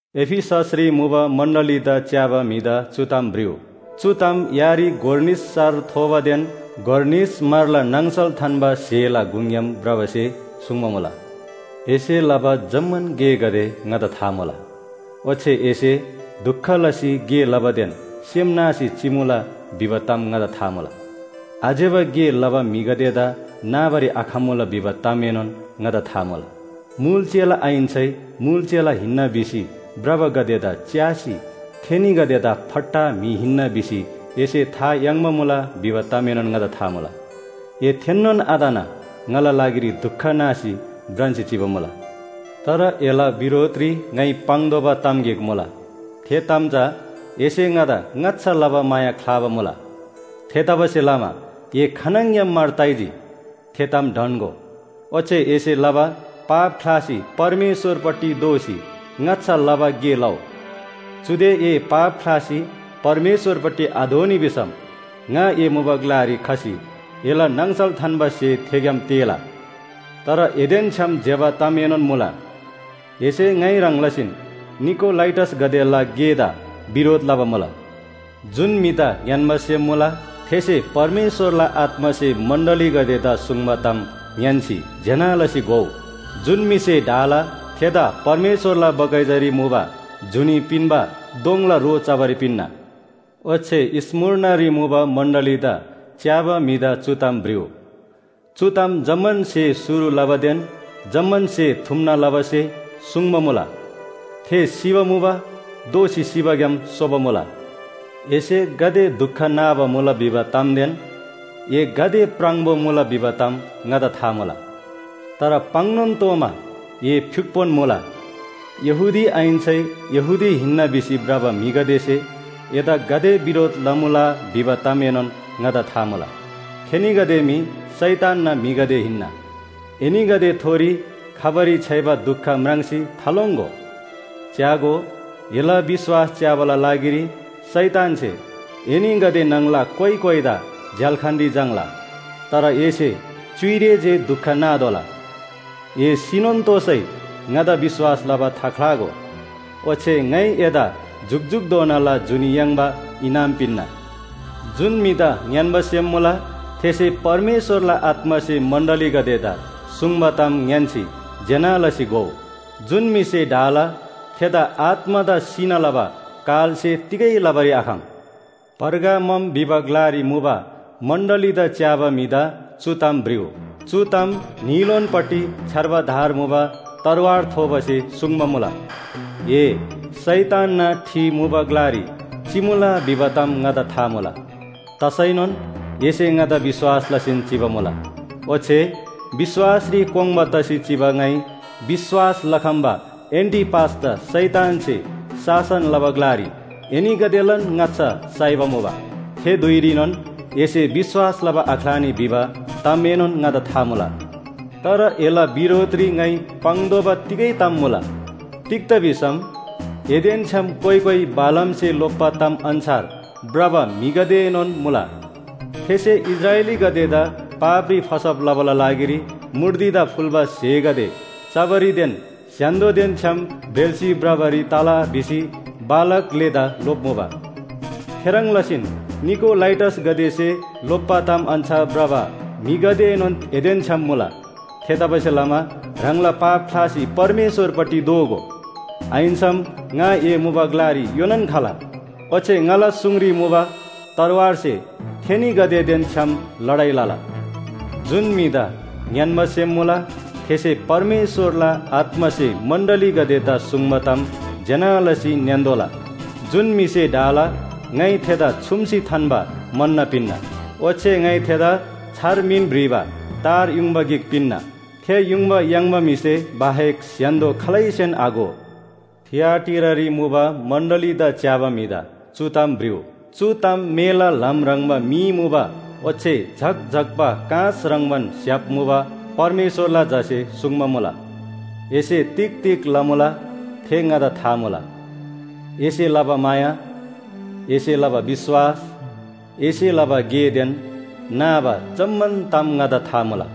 एफिससरी मुबा मण्‍डलीदा च्‍याबा म्‍हिदा चु ताम भ्रिउ। चु ताम यारी गोर निस सार थोबादेन गोर निस म्‍हरला नाङसल थान्‍बा स्‍हेला गुङग्‍याम भ्रबासे सुङ्बा मुला। एसे लबा जम्‍मान गेगदे ङादा था मुला। ओच्‍छे एसे दुख लसी गे लबादेन सेम नासी चिमुला भिबा ताम ङादा था मुला। आज्‍यबा गे लबा म्‍हिगदेदा नाबारी आखम्‍मुला भिबा तामएनोन ङादा था मुला। मुल चेला आहिन्‍सै मुल चेला हिन्‍ना भिसी भ्रबागदेदा च्‍यासी थेनीगदेदा फट्टा म्‍हि हिन्‍ना भिसी एसे था याङ्बा मुला भिबा तामएनोन ङादा था मुला। ए थेन्‍नोन आतना ङाला लागिरी दुख नासी भ्रान्‍सी चिबा मुला। तर एला बिरोधरी ङाइ पाङ्तोःबा ताम गिक मुला। थे ताम चा एसे ङादा ङाच्‍छा लबा माया ख्‍लाबा मुला। थेतबासेलमा ए खानङग्‍याम मार ताइजी, थे ताम ढन्‍गो। ओच्‍छे एसे लबा पाप ख्‍लासी परमेश्‍वरपट्टि दोःसी ङाच्‍छा लबा गे लउ। चुदे ए पाप ख्‍लासी परमेश्‍वरपट्टि आदोःनी भिसम ङा ए मुबा ग्‍लारी खसी एला नाङसल थान्‍बा स्‍हे थेग्‍याम तेःला। तर एदेन छ्‌याम ज्‍यबा तामएनोन मुला, एसे ङाइ ह्रङ् लसीन निकोलाइटसगदेला गेदा बिरोध लबा मुला। जुन म्‍हिदा ङ्‌यान्‍बा सेम मुला, थेसे परमेश्‍वरला आत्‍मासे मण्‍डलीगदेदा सुङ्बा ताम ङ्‌यान्‍सी ज्‍यना लसी घोउ। जुन म्‍हिसे ढाला थेदा परमेश्‍वरला बगैँचारी मुबा जुनी पिन्‍बा दोङला रो चबारी पिन्‍ना। ओच्‍छे स्‍मुर्नारी मुबा मण्‍डलीदा च्‍याबा म्‍हिदा चु ताम भ्रिउ। चु ताम जम्‍मान स्‍हे शुरु लबादेन जम्‍मान स्‍हे थुम्‍ना लबासे सुङ्बा मुला, थे सिबा मुबा दोःसी सिबाग्‍याम सोबा मुला। एसे गाते दुख नाबा मुला भिबा तामदेन ए गाते प्राङबो मुला भिबा ताम ङादा था मुला। तर पाङ्‌नोन तोःमा ए फ्‍युक्‍पोन मुला। यहूदी आहिन्‍सै यहूदी हिन्‍ना भिसी भ्रबा म्‍हिगदेसे एदा गाते बिरोध लमुला भिबा तामएनोन ङादा था मुला। थेनीगदे मी शैतानना म्‍हिगदे हिन्‍ना। एनीगदेथोरी खबारी छ्‌याइबा दुख म्राङ्सी थालोङ्‍गो। च्‍यागो, एला विश्‍वास च्‍याबाला लागिरी शैतानसे एनीगदे न्‍हङला कोइ कोइदा झ्‍याल्‍खानरी झाङ्‌ला। तर एसे च्‍युइरे जे दुख नातोःला। ए सिनोन तोःसै ङादा विश्‍वास लबा थाख्‍लागो। ओच्‍छे ङाइ एदा जुकजुकधोनाला जुनी याङ्बा इनाम पिन्‍ना। जुन म्‍हिदा ङ्‌यान्‍बा सेम मुला, थेसे परमेश्‍वरला आत्‍मासे मण्‍डलीगदेदा सुङ्बा ताम ङ्‌यान्‍सी ज्‍यना लसी घोउ। जुन म्‍हिसे ढाला थेदा आत्‍मादा सिना लबा कालसे तिगै लबारी आखम। पर्गामम भिबा ग्‍लारी मुबा मण्‍डलीदा च्‍याबा म्‍हिदा चु ताम भ्रिउ। चु ताम न्‍हीलोनपट्टि छ्‌यार्बा धार मुबा तरवार थोबासे सुङ्बा मुला। ए शैतानना ठि मुबा ग्‍लारी चिमुला भिबा ताम ङादा था मुला। तसैनोन एसे ङादा विश्‍वास लसीन चिबा मुला, ओच्‍छे विश्‍वासरी कोङ्बा तसी चिबा ङाइ विश्‍वास लखम्‍बा एन्‍टिपासदा शैतानसे शासन लबा ग्‍लारी एनीगदेलान ङाच्‍छा साइबा मुबा। थे धुइरीनोन एसे विश्‍वास लबा आख्‍लानी भिबा तामएनोन ङादा था मुला। तर एला बिरोधरी ङाइ पाङ्तोःबा तिगै ताम मुला। तिग्‍दा भिसम एदेन छ्‌याम कोइ कोइ बालामसे लोप्‍बा ताम अन्‍छार भ्रबा म्‍हिगदेएनोन मुला। थेसे इस्राएलीगदेदा पापरी फसब लबाला लागिरी मूर्तिदा फुल्‍बा स्‍हेगदे चबारीदेन स्‍य्‍हान्‍दोदेन छ्‌याम ब्रेल्‍सी भ्रबारी तला भिसी बालाक ग्‍लेदा लोप्‍मुबा। थेह्रङ् लसीन निकोलाइटसगदेसे लोप्‍बा ताम अन्‍छार भ्रबा म्‍हिगदेएनोन एदेन छ्‌याम मुला। थेतबासेलमा ह्राङला पाप ख्‍लासी परमेश्‍वरपट्टि दोःगो। आहिन्‍सम ङा ए मुबा ग्‍लारी योनान खला ओच्‍छे ङाला सुङरी मुबा तरवारसे थेनीगदेदेन छ्‌याम लडाइ लला। जुन म्‍हिदा ङ्‌यान्‍बा सेम मुला, थेसे परमेश्‍वरला आत्‍मासे मण्‍डलीगदेदा सुङ्बा ताम ज्‍यना लसी ङ्‌यान्‍तोःला। जुन म्‍हिसे ढाला, ङाइ थेदा छुम्‍सी थान्‍बा मन्‍न पिन्‍ना। ओच्‍छे ङाइ थेदा छार मिन भ्रिबा तार युङबा गिक पिन्‍ना, थे युङबा याङ्बा म्‍हिसे बाहेक स्‍य्‍हान्‍दो खालैसेन आघो। थिआटीरारी मुबा मण्‍डलीदा च्‍याबा म्‍हिदा चु ताम भ्रिउ। चु ताम मेला ल्‍हाम ह्रङ्‌बा मी मुबा ओच्‍छे झक्‍झक्‍बा काँस ह्रङ्‌बान स्‍य्‍हाप मुबा परमेश्‍वरला झासे सुङ्बा मुला। एसे तिग तिग लमुला थे ङादा था मुला। एसे लबा माया, एसे लबा विश्‍वास, एसे लबा गेदेन नाबा जम्‍मान ताम ङादा था मुला।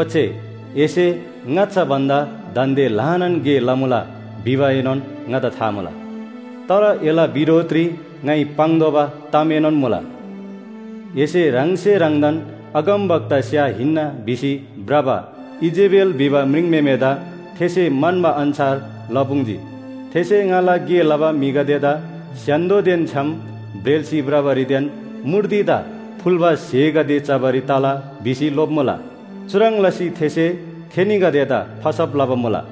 ओच्‍छे एसे ङाच्‍छा भन्‍दा दान्‍दे ल्‍हानान गे लमुला भिबाएनोन ङादा था मुला। तर एला बिरोधरी ङाइ पाङ्तोःबा तामएनोन मुला। एसे ह्राङसे ह्राङदान अगमवक्तास्‍या हिन्‍ना भिसी भ्रबा इजेबेल भिबा म्रिङम्‍हेमेदा थेसे म्‍हन्‍बा अन्‍छार लपुङ्‌जी। थेसे ङाला गे लबा म्‍हिगदेदा स्‍य्‍हान्‍दोदेन छ्‌याम ब्रेल्‍सी भ्रबारीदेन मूर्तिदा फुल्‍बा स्‍हेगदे चबारी तला भिसी लोप्‍मुला। चुह्रङ् लसी थेसे थेनीगदेदा फसब लबा मुला।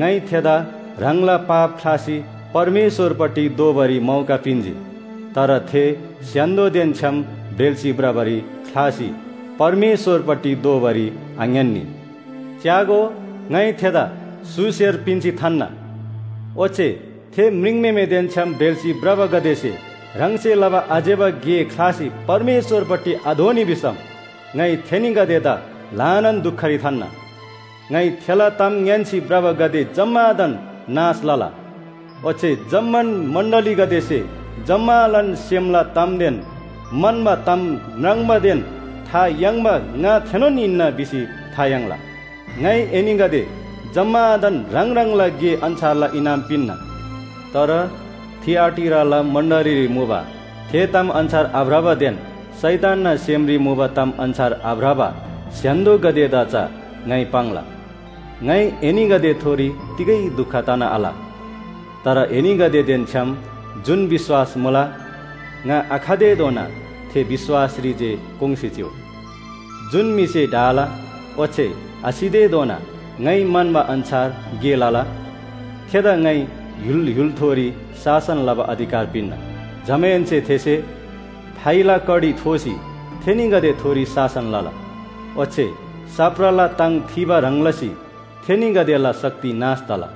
ङाइ थेदा ह्राङला पाप ख्‍लासी परमेश्‍वरपट्टि दोःबारी मौका पिन्‍जी। तर थे स्‍य्‍हान्‍दोदेन छ्‌याम ब्रेल्‍सी भ्रबारी ख्‍लासी परमेश्‍वरपट्टि दोःबारी आङ्‌यान्‍नी। च्‍यागो, ङाइ थेदा स्‍हु स्‍हेर पिन्‍सी थान्‍ना। ओच्‍छे थे म्रिङम्‍हेमेदेन छ्‌याम ब्रेल्‍सी भ्रबागदेसे ह्राङसे लबा आज्‍यबा गे ख्‍लासी परमेश्‍वरपट्टि आदोःनी भिसम ङाइ थेनीगदेदा ल्‍हानान दुखरी थान्‍ना। ङाइ थेला ताम ङ्‌यान्‍सी भ्रबागदे जम्‍मादान नाश लला। ओच्‍छे जम्‍मान मण्‍डलीगदेसे जम्‍मालान सेमला तामदेन म्‍हन्‍बा ताम म्राङ्बादेन था याङ्बा ङा थेनोन हिन्‍ना भिसी था याङ्ला। ङाइ एनीगदे जम्‍मादान ह्राङ ह्राङला गे अन्‍छारला इनाम पिन्‍ना। तर थिआटीराला मण्‍डलीरी मुबा थे ताम अन्‍छार आभ्रबादेन शैतानना सेमरी मुबा ताम अन्‍छार आभ्रबा स्‍य्‍हान्‍दोगदेदा चा ङाइ पाङ्ला। ङाइ एनीगदेथोरी तिगै दुख तना आल। तर एनीगदेदेन छ्‌याम जुन विश्‍वास मुला, ङा आखतेधोना थे विश्‍वासरी जे कोङ्‌सी चिउ। जुन म्‍हिसे ढाला ओच्‍छे आसितेधोना ङाइ म्‍हन्‍बा अन्‍छार गे लला, थेदा ङाइ य्‍हुल य्‍हुलथोरी शासन लबा अधिकार पिन्‍ना। जमाहेन्‍से थेसे फाइला कडी थोसी थेनीगदेथोरी शासन लला। ओच्‍छे साप्राला ताङ थिबा ह्रङ् लसी थेनीगदेला शक्ति नाश तला।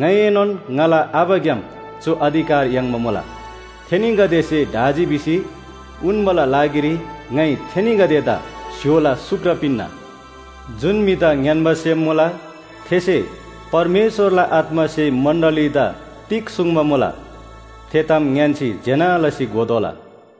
ङाइएनोन ङाला आबाग्‍याम चु अधिकार याङ्बा मुला। थेनीगदेसे ढाजी भिसी उन्‍बाला लागिरी ङाइ थेनीगदेदा स्‍य्‍होला सुक्र पिन्‍ना। जुन म्‍हिदा ङ्‌यान्‍बा सेम मुला थेसे परमेश्‍वरला आत्‍मासे मण्‍डलीदा तिग सुङ्बा मुला, थे ताम ङ्‌यान्‍सी ज्‍यना लसी घोतोःला।